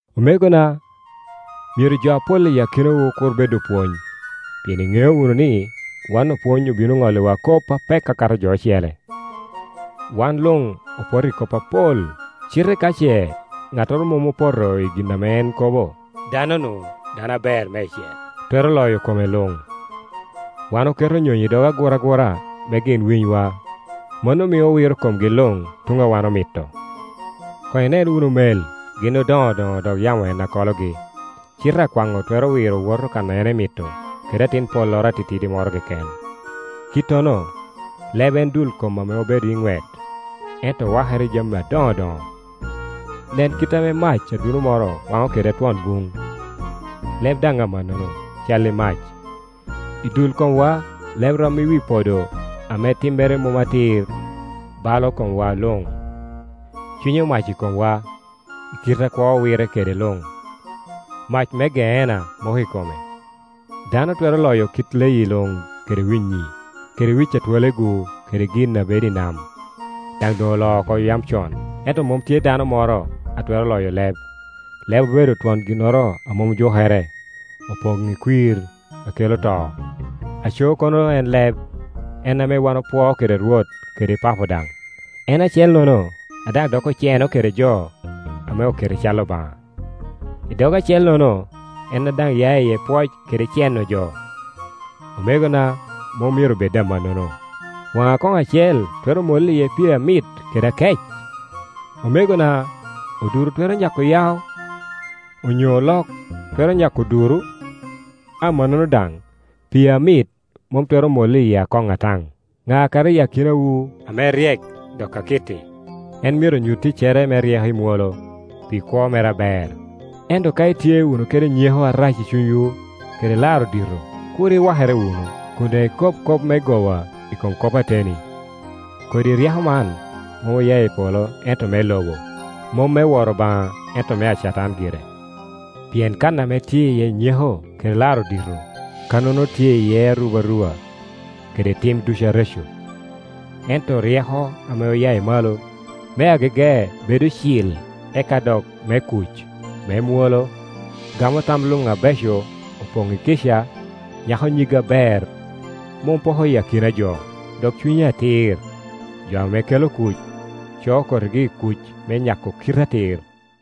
Omegona, myero jo apol i akinawu kur bed opwony, pien iŋeo wunu ni wan opwony obino ŋolliwa kop apek akato jo ocele. Wan luŋ opoto i kop apol, cite ka ce ŋattoro mom opoto i gin ame en kobo, dano-nu dano aber meicel, twero loyo kome luŋ. Wan oketo nyonyo i dog aguragura me gin winywa; mano mio owiro komgi luŋ tuŋ a wan omito. Koŋ inen wunu mel, gin odoŋodoŋo, dok yamo en a kologi, cite akwaŋŋo twero wiro woto kan emito kede atin polloro atitidi moro keken. Kittono, leb en dul kom ame obedo iŋwet, ento wakere i jami adoŋodoŋo. Nen kite ame mac aduno moro waŋo kede twon buŋ! Leb daŋ amannono, calli mac. I dul komwa, leb rom i wi podo ame timmere mom atir balo komwa luŋ; cwinyo mac i komwa, i kite a kwo wirre kede luŋ; mac me Geena moko i kome. Dano twero loyo kit leyi luŋ kede winnyi, kede wic a twolegu, kede gin a bedo i nam, daŋ doŋ oloo oko yam con, ento mom tye dano moro a twero loyo leb. Leb obedo twon ginnoro a mom jukere, opoŋ i kwir a kelo to. Aco kono en leb, en ame wan opwoo kede Rwot kede Papo daŋ, en acellono a daŋ dok oceno kede jo ame oketo i cal Obaŋa. I dog acellono en a daŋ ya iye pwoc kede ceno jo. Omegona, mom myero bed amannono. Waŋ akoŋ acel twero mollo iye pii amit kede akec? Omegona, oduro twero nyako yao? Onyo olok twero nyako oduro? Amannono daŋ, pii amit mom twero mollo i akoŋ ataŋ. Ŋa kara i akinawu ame ryek dok akitti? En myero nyut ticcere me ryeko i mwolo, pi kwo mere aber. Ento ka itye wunu kede nyeko arac i cunywu, kede laro dito, kur iwakere wunu, kun daŋ ikob kop me goba i kom kop ateni. Kodi ryeko man mom oya i polo ento me lobo, mom me woro Obaŋa ento mea Catan gire. Pien kan ame tye iye nyeko kede laro dito, kannono tye iye arubaruba kede tim ducu areco. Ento ryeko ame oya i malo, me agege bedo cil, eka dok me kuc, me mwolo, gamo tam luŋ abeco, opoŋ i kica, nyako nyig aber, mom poko i akina jo, dok cunye atir. Jo ame kelo kuc, coo kotigi i kuc me nyako kite atir.